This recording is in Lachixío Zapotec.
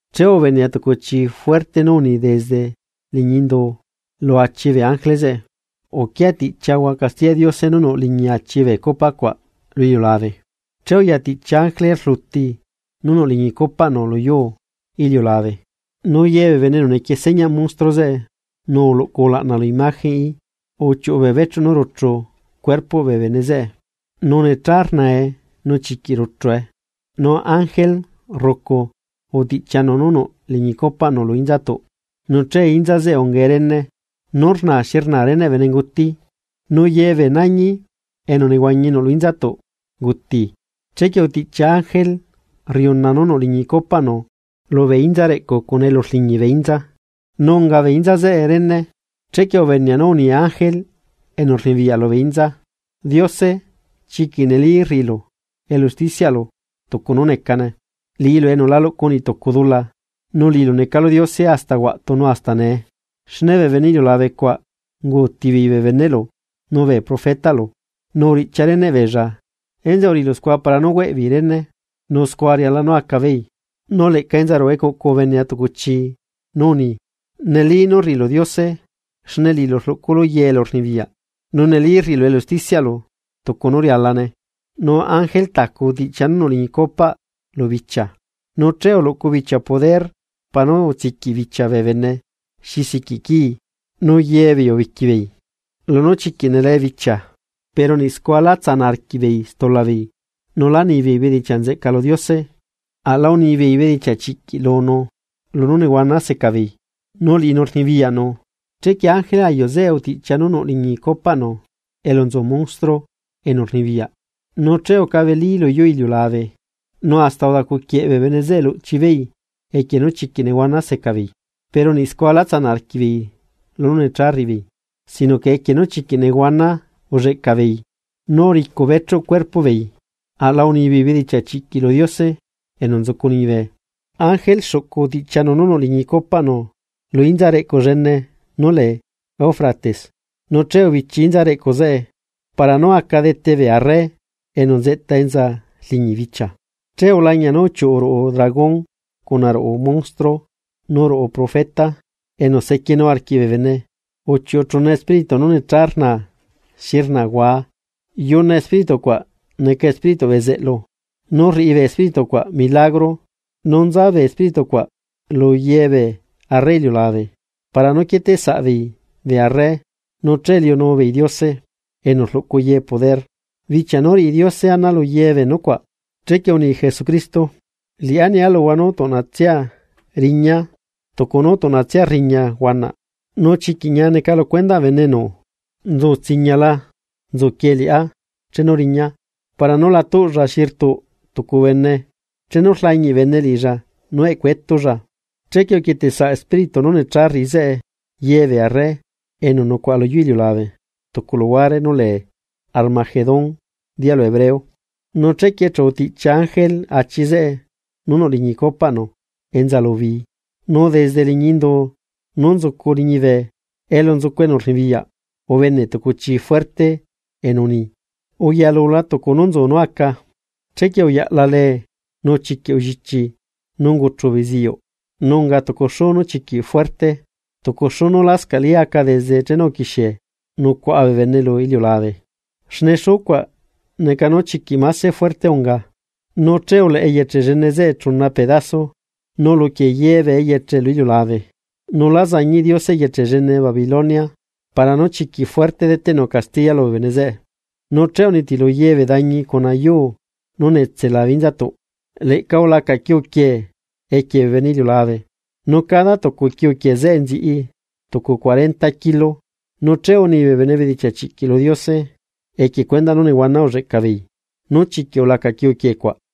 Che ubenea tucu chi fuerte nú uni desde liñi indu lu achi bee ángele zeꞌe: ―Uquia tiꞌchiahua castiyaꞌ Diose nú nuꞌ liñi achi bee copa cuaꞌ lu iliulabe. Che uya tiꞌchia ángele rluti nú nuꞌ liñi copaꞌnu luyuu iliulabe. Nu ye bee bene enu nequie señaꞌ monstruo zeꞌe nu uluꞌcu ulaꞌna lu imagenꞌí, uchiuꞌu bee bechuꞌ nú ruchu cuerpoꞌ bee bene zeꞌe, nu necha rnae nu chiquiꞌ rcue. Nu ángele rrucu utiꞌchianu nú nuꞌ liñi copaꞌnu lu inzatuꞌ. Nu che inza zeꞌe ungae rene nú rna xi rna reneꞌ benenguti, nu ye bee nañi enu nehuañi nuꞌ lu inzatuꞌ unguti. Chequie utiꞌchia ángele rriuna nú nuꞌ liñi copaꞌnu lubee inza reꞌcu cuna elu rliñi bee inza, nu unga bee inza zeꞌe rene. Chequie ubenea nú uni ángele enu rnibiyaꞌ lubee inza: ―Diose chiquiꞌ neli rriꞌilu elu ustichiaꞌlu tucu nú necane, liꞌilu enu la luꞌcu niꞌtucu dula, nu liꞌilu necalu Diose hasta huaꞌtu nu hasta nee. Xne bee bene iliulabecuaꞌ unguuti beei bee beneꞌlu, nu bee profetaꞌlu nu uriꞌchia reneꞌ beella, enzeꞌe uriꞌilu scua para nú hueꞌbeei rene, ¡nu scua riala nú aca beei! Nu leꞌca enza ruꞌu ecuꞌcu ubenea tucu chi nú uni: ―Neli nú rriꞌilu Diose, xne liꞌilu rluꞌculu ye poder. Nu neli rriꞌilu elu usticiaꞌlu tucu nú rialane. Nu ángele tacu utiꞌchia nú nuꞌ liñi copaꞌ lubichia, nu che uluꞌcu bichia poder para nú utsiquiꞌ bichia bee bene xi siquiꞌ quii. Nu ye beei ubiquibeei lunú chiquiꞌ nelee bichia pero niꞌ scua lá tsanaꞌ arquiꞌbeei stulabeei, nu lá nibeei bedichiaꞌ nzeꞌca lu Diose, aꞌla unibeei bedichiaꞌ chiꞌquiꞌ lunu, lunú nehuana seca beei, nu liꞌinu rnibiyaꞌnu. Chequie ángele ayuꞌ zeꞌe utiꞌchia nú nuꞌ liñi copaꞌnu elu nzu monstruo enu rnibiyaꞌ, nu che ucabelí luyuu iliulabe nu hasta udacuquieꞌ bee bene zeꞌe luꞌchibeei equie nú chiquiꞌ nehuana seca beei. Pero niꞌ scua lá tsanaꞌ arquiꞌbeei lunú necha rriꞌi beei, sino que equie nú chiquiꞌ nehuana ulleꞌca beei nú uricu bechuꞌ cuerpoꞌ beei, aꞌla unibeei bedichiaꞌ chiꞌquiꞌ lu Diose enu nzucu liñibe. Ángele xuꞌcu utiꞌchianu nú nuꞌ liñi copaꞌnu lu inza reꞌcu llene nú lee Eufrates nu che ubichi inza reꞌcu zeꞌe para nú aca dete bee arre enu nzeꞌta enza rliñi bichia. Che ulañia nú uchiuꞌu ruꞌu dragón cuna ruꞌu monstruo nu ruꞌu profeta enu sequienu arquiꞌ bee bene, nu uchiuꞌu chuna espíritu nú necha rnaa xi rnaa huaa. Yuna espíritucuaꞌ neca espírituꞌ bezeꞌlu, nu rriꞌi bee espíritucuaꞌ milagro nu nza bee espíritu cuaꞌ lu ye bee arre iliulabe para nú quieteꞌsaꞌbeei bee arre nu che liunu beei Diose enu rluꞌcu ye poder, bichia nú riꞌi Diose ana lu ye bee nucuaꞌ. Chequie uni Jesucristo: “Liꞌá nia luhua nú tuꞌnatsia riña, tucu nú tuꞌnatsia rriña huanaꞌ. Nu chiquiꞌ ñia neca lu cuendaꞌ bene enu nzu tsiñala nzuquie liꞌá chenu riña para nú la tuꞌlla xi rtuꞌ tucu bene chenu rlañiꞌ bene liꞌilla nú eꞌcuetulla.” Chequie uquieteꞌsaꞌ espíritu nú necha rriꞌi zeꞌe ye bee arre enu nucuaꞌa luyuu iliulabe tucu luhuare nú lee Armagedón dialu hebreo. Nu chequie chu utiꞌchia ángele achi zeꞌe nú nuꞌ liñi copaꞌnu enza lu bi, nu desde liñi indu nú nzucu liñibe elu nzucu enu rnibiyaꞌ ubene tucu chi fuerte enu uni: ―Uyalula tucu nú nzu nú aca. Chequie uyaꞌla lee, nu chiquiꞌ ullichi nú unguchu beziuꞌ, nu unga tucu xuu nú chiquiꞌ fuerte, tucu xuu nú lascaꞌli aca desde chenu uquixie nucuaꞌa bee bene lu iliulabe, xne xuu cuaꞌ neca nú chiquiꞌ máse fuerte unga. Nu che uleꞌe eyeche llene zeꞌe chuna pedazo nu uluquie ye bee eyeche lu iliulabe. Nu lá zañiꞌ Diose eyeche llene Babilonia para nú chiquiꞌ fuerte deteꞌnu castiya lubee bene zeꞌe. Nu che unitilu ye bee dañi cuna yuu nú netse labe inzatuꞌ. Leꞌca ulaca quiu quiee equie bee bene iliulabe nu cada tucu quiu quiee zeꞌe nziꞌi tucu cuarenta kilo, nu che uni bee bene bedichiaꞌ chiꞌquiꞌ lu Diose, equie cuendaꞌ nú nehuana ulleꞌcabeei nú chiquiꞌ ulaca quiuquiee cuaꞌ.